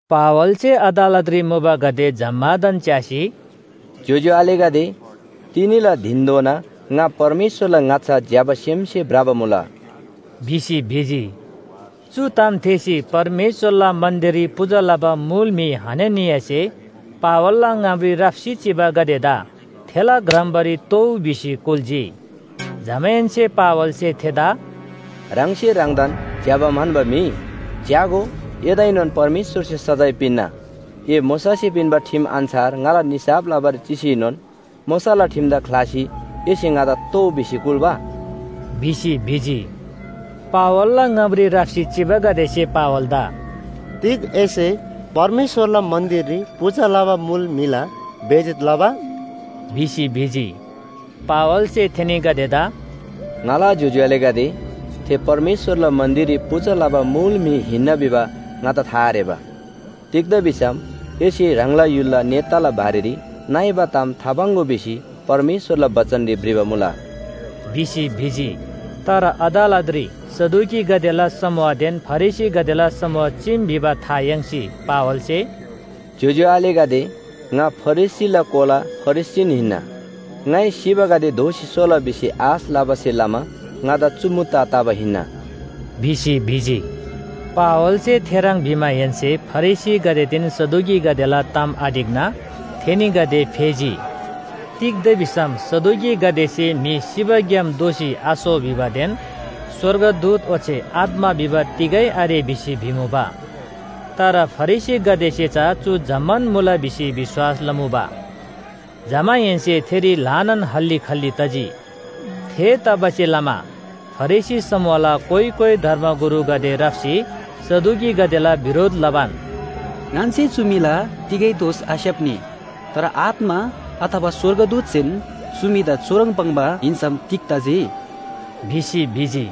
पावलसे अदालतरी मुबागदे जम्‍मादान च्‍यासी, “ज्‍योज्‍यो आलेगदे, तिनीला धिनधोना ङा परमेश्‍वरला ङाच्‍छा ज्‍यबा सेमसे भ्रबा मुला” भिसी भिजी। चु ताम थेःसी परमेश्‍वरला मन्‍दिररी पूजा लबा मुल म्‍हि हननियासे पावलला ङामरी राप्‍सी चिबागदेदा थेला ग्रम्‍बारी तोउ भिसी कुल्‍जी। जमाहेन्‍से पावलसे थेदा “ह्राङसे ह्राङदान ज्‍यबा म्‍हन्‍बा म्‍हि! च्‍यागो, एदाएनोन परमेश्‍वरसे सजाय पिन्‍ना। ए मोशासे पिन्‍बा ठिम अन्‍छार ङाला निसाफ लबारी चिसीनोन मोशाला ठिमदा ख्‍लासी एसे ङादा तोउ भिसी कुल्‍बा?” भिसी भिजी। पावलला ङामरी राप्‍सी चिबागदेसे पावलदा “तिग एसे परमेश्‍वरला मन्‍दिररी पूजा लबा मुल म्‍हिला बेइज्‍जत लबा?” भिसी भिजी। पावलसे थेनीगदेदा “ङाला ज्‍योज्‍यो आलेगदे, थे परमेश्‍वरला मन्‍दिररी पूजा लबा मुल म्‍हि हिन्‍ना भिबा ङादा था आरेबा। तिग्‍दा भिसम ‘एसे ह्राङला य्‍हुलला नेताला बारेरी नइबा ताम थापाङ्‍गो’ भिसी परमेश्‍वरला बचनरी भ्रिबा मुला” भिसी भिजी। तर अदालतरी सदुकीगदेला समूहदेन फरिसीगदेला समूह चीम भिबा था याङ्सी पावलसे “ज्‍योज्‍यो आलेगदे, ङा फरिसीला कोला फरिसीन हिन्‍ना। ङाइ सिबागदे दोःसी सोला भिसी आश लबासे लमा ङादा चु मुद्दा तबा हिन्‍ना” भिसी भिजी। पावलसे थेह्रङ् भिमाहेन्‍से फरिसीगदेदेन सदुकीगदेला ताम आढिक्‍ना थेनीगदे फेजी। तिग्‍दा भिसम सदुकीगदेसे म्‍हि सिबाग्‍याम दोःसी आसो भिबादेन स्‍वर्गदूत ओच्‍छे आत्‍मा भिबा तिगै आरे भिसी भिमुबा। तर फरिसीगदेसे चा चु जम्‍मान मुला भिसी विश्‍वास लमुबा। जमाहेन्‍से थेरी ल्‍हानान हल्‍ली खल्‍ली तजी। थेतबासेलमा फरिसी समूहला कोइ कोइ धर्मगुरुगदे राप्‍सी सदुकीगदेला बिरोध लबान, “ङन्‍से चु म्‍हिला तिगै दोष आस्‍याप्‍नी। तर आत्‍मा अथवा स्‍वर्गदूतसेन चु म्‍हिदा चुह्रङ् पाङ्बा हिन्‍सम तिग तजी?” भिसी भिजी।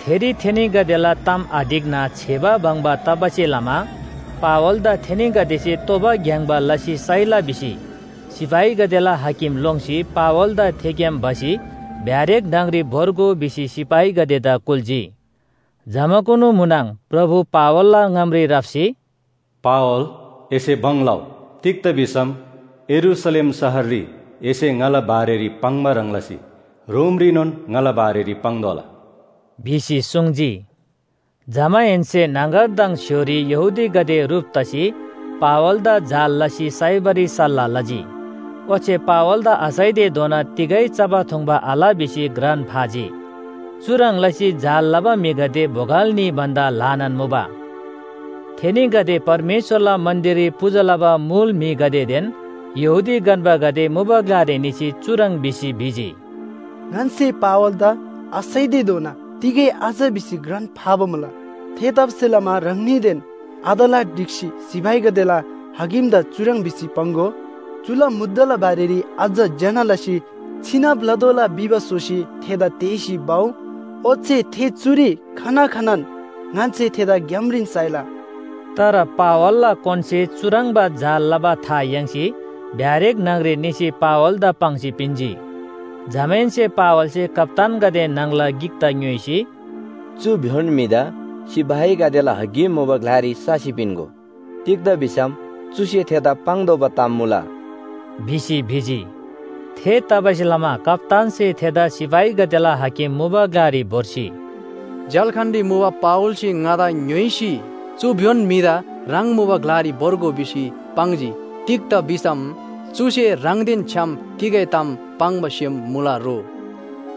थेरी थेनीगदेला ताम आढिक्‍ना छेबा बङ्बा तबासे लमा पावलदा थेनीगदेसे तोबा ग्‍याङ्‍बा लसी साइला भिसी सिपाहीगदेला हाकिम लोङ्सी पावलदा थेग्‍याम भसी ब्‍यारेक न्‍हङरी भोर्गो भिसी सिपाहीगदेदा कुल्‍जी। जमाकुनु म्‍हुनङ प्रभु पावलला ङामरी राप्‍सी, “पावल एसे भङ लउ। तिग्‍दा भिसम यरूशलेम शहररी एसे ङाला बारेरी पाङ्बा ह्रङ् लसी रोमरीनोन ङाला बारेरी पाङ्तोःला” भिसी सुङ्जी। जमाहेन्‍से न्‍हङगरदङ स्‍य्‍होरी यहूदीगदे ह्रुप तसी पावलदा जाल लसी साइबारी सल्‍लाह लजी। ओच्‍छे पावलदा आसाइतेधोना तिगै चबा थुङ्बा आल भिसी घ्रान फाजी। चुह्रङ् लसी जाल लबा म्‍हिगदे बोगल न्‍ही भन्‍दा ल्‍हानान मुबा। थेनीगदे परमेश्‍वरला मन्‍दिररी पूजा लबा मुल म्‍हिगदेदेन यहूदी गन्‍बागदे मुबा ग्‍लारी निसी चुह्रङ् भिसी भिजी, “ङन्‍से पावलदा आसाइतेधोना तिगै आच भिसी घ्रान फाबा मुला। थेतबासेलमा ह्राङनीदेन अदालत ढिक्‍सी सिपाहीगदेला हाकिमदा चुह्रङ् भिसी पाङ्‍गो, चुला मुद्दाला बारेरी अझ ज्‍यना लसी छिनब लतोःला भिबा स्‍होसी थेदा तेःसी भउ। ओच्‍छे थे चुरी खना खनान ङन्‍से थेदा ग्‍यामरीन साइला।” तर पावलला कोनसे चुह्रङ्बा जाल लबा था याङ्सी ब्‍यारेक न्‍हङरी निसी पावलदा पाङ्सी पिन्‍जी। जमाहेन्‍से पावलसे कप्‍तानगदे न्‍हङला गिकदा ङ्‌योइसी, “चु भ्‍योन म्‍हिदा सिपाहीगदेला हाकिम मुबा ग्‍लारी ससी पिन्‍गो। तिग्‍दा भिसम चुसे थेदा पाङ्तोःबा ताम मुला” भिसी भिजी। थेतबासेलमा कप्‍तानसे थेदा सिपाहीगदेला हाकिम मुबा ग्‍लारी भोर्सी, “झ्‍याल्‍खानरी मुबा पावलसे ङादा ङ्‌योइसी चु भ्‍योन म्‍हिदा ह्राङ मुबा ग्‍लारी भोर्गो भिसी पाङ्जी। तिग्‍दा भिसम चुसे ह्राङदेन छ्‌याम तिगै ताम पाङ्बा सेम मुला रो”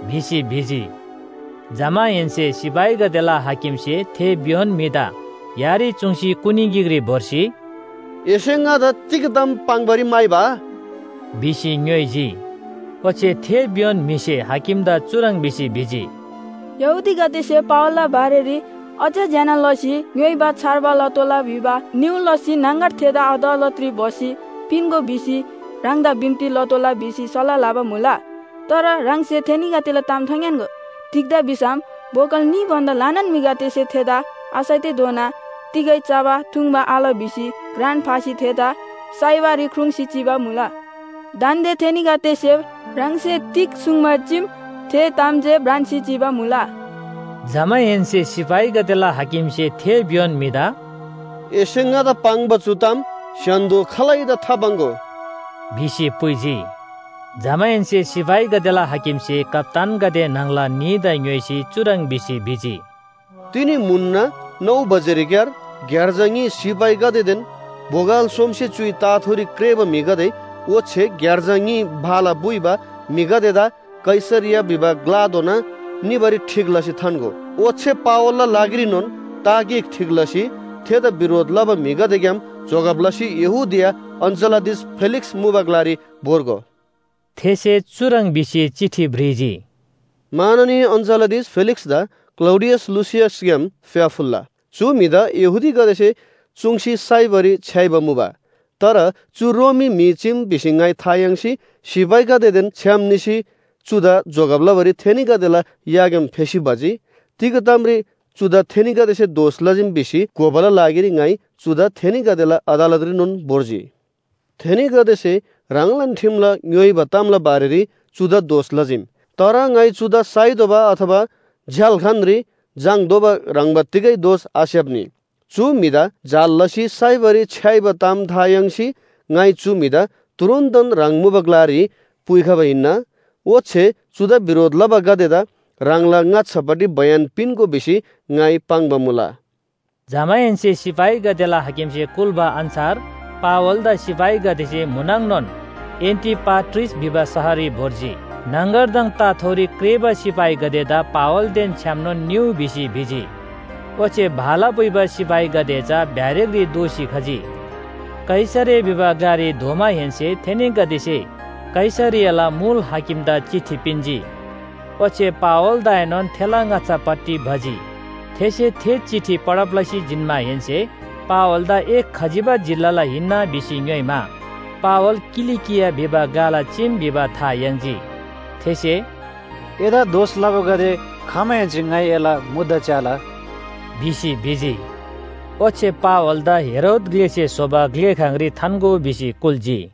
भिसी भिजी। जमाहेन्‍से सिपाहीगदेला हाकिमसे थे भ्‍योन म्‍हिदा यारी चुङ्सी कुनी गिकरी भोर्सी, “एसे ङादा तिग ताम पाङ्‌बारी म्‍हाइबा?” भिसी ङ्‌योइजी। ओच्‍छे थे भ्‍योन म्‍हिसे हाकिमदा चुह्रङ् भिसी भिजी, “यहूदीगदेसे पावलला बारेरी अझ ज्‍यना लसी ङ्‌योइबा छार्बा लतोःला भिबा निहुँ लसी न्‍हङगर थेदा अदालतरी भसी पिन्‍गो भिसी ह्राङदा बिन्‍ती लतोःला भिसी सल्‍लाह लबा मुला। तर ह्राङसे थेनीगदेला ताम थाङ्‌यान्‍गो। तिग्‍दा भिसम बोगल न्‍ही भन्‍दा ल्‍हानान म्‍हिगदेसे थेदा आसाइतेधोना तिगै चबा थुङ्बा आल भिसी घ्रान फासी थेदा साइबारी ख्रुङ्‌सी चिबा मुला। दान्‍दे थेनीगदेसे ह्राङसे तिग सुङ्बा चीम थे ताम जे भ्रान्‍सी चिबा मुला।” जमाहेन्‍से सिपाहीगदेला हाकिमसे थे भ्‍योन म्‍हिदा “एसे ङादा पाङ्बा चु ताम स्‍य्‍हान्‍दो खालैदा थापाङ्‍गो” भिसी पुइजी। जमाहेन्‍से सिपाहीगदेला हाकिमसे कप्‍तानगदे न्‍हङला न्‍हीदा ङ्‌योइसी चुह्रङ् भिसी भिजी, “तिनी म्‍हुनना नौ बजेरीक्‍यार ग्‍यार्जा न्‍ही सिपाहीगदेदेन बोगल सोमसे च्‍युइ ताथोरी क्रेःबा म्‍हिगदे ओच्‍छे ग्‍यार्जा न्‍ही भाला पुइबा म्‍हिगदेदा कैसरिया भिबा ग्‍लाधोना निबारी ठीक लसी थान्‍गो। ओच्‍छे पावलला लागिरीनोन ता गिक ठीक लसी थेदा बिरोध लबा म्‍हिगदेग्‍याम जोगब लसी यहूदिया अञ्‍चलाधीश फेलिक्‍स मुबा ग्‍लारी भोर्गो।” थेसे चुह्रङ् भिसी चिठी भ्रिजी, “माननीय अञ्‍चलाधीश फेलिक्‍सदा क्‍लौडियस लुसियसग्‍याम फ्‍याफुल्‍ला! चु म्‍हिदा यहूदीगदेसे चुङ्सी साइबारी छ्‌याइबा मुबा। तर चु रोमी म्‍हि चीम भिसी ङाइ था याङ्सी सिपाहीगदेदेन छ्‌याम निसी चुदा जोगब लबारी थेनीगदेला याग्‍याम फेसी भजी। तिग तामरी चुदा थेनीगदेसे दोष लजीम भिसी घोबाला लागिरी ङाइ चुदा थेनीगदेला अदालतरीनोन भोर्जी। थेनीगदेसे ह्राङलान ठिमला ङ्‌योइबा तामला बारेरी चुदा दोष लजीम। तर ङाइ चुदा साइतोःबा अथवा झ्‍याल्‍खानरी झाङ्‌तोःबा ह्रङ्‌बा तिगै दोष आस्‍याप्‍नी। चु म्‍हिदा जाल लसी साइबारी छ्‌याइबा ताम था याङ्सी ङाइ चु म्‍हिदा तुरुन्‍तन ह्राङ मुबा ग्‍लारी पुइखबा हिन्‍ना। ओच्‍छे चुदा बिरोध लबागदेदा ह्राङला ङाच्‍छापट्टि बयान पिन्‍गो भिसी ङाइ पाङ्बा मुला।” जमाहेन्‍से सिपाहीगदेला हाकिमसे कुल्‍बा अन्‍छार पावलदा सिपाहीगदेसे म्‍हुनङनोन एन्‍टिपाट्रिस भिबा शहररी भोर्जी। न्‍हङगरदङ ताथोरी क्रेःबा सिपाहीगदेदा पावलदेन छ्‌यामनोन निउ भिसी भिजी। ओच्‍छे भाला पुइबा सिपाहीगदे चा ब्‍यारेकरी दोःसी खजी। कैसरिया भिबा ग्‍लारी धोमाहेन्‍से थेनीगदेसे कैसरियाला मुल हाकिमदा चिठी पिन्‍जी। ओच्‍छे पावलदाएनोन थेला ङाच्‍छापट्टि भजी। थेसे थे चिठी पढब लसी जिन्‍माहेन्‍से पावलदा ए खजिबा जिल्‍लाला हिन्‍ना भिसी ङ्‌योइमा, पावल किलिकिया भिबा ग्‍लाला चीम भिबा था याङ्जी। थेसे “एदा दोष लबागदे खमाहेन्‍से ङाइ एला मुद्दा च्‍याला” भिसी भिजी। ओच्‍छे पावलदा हेरोद ग्‍लेसे स्‍होबा ग्‍लेखाङरी थान्‍गो भिसी कुल्‍जी।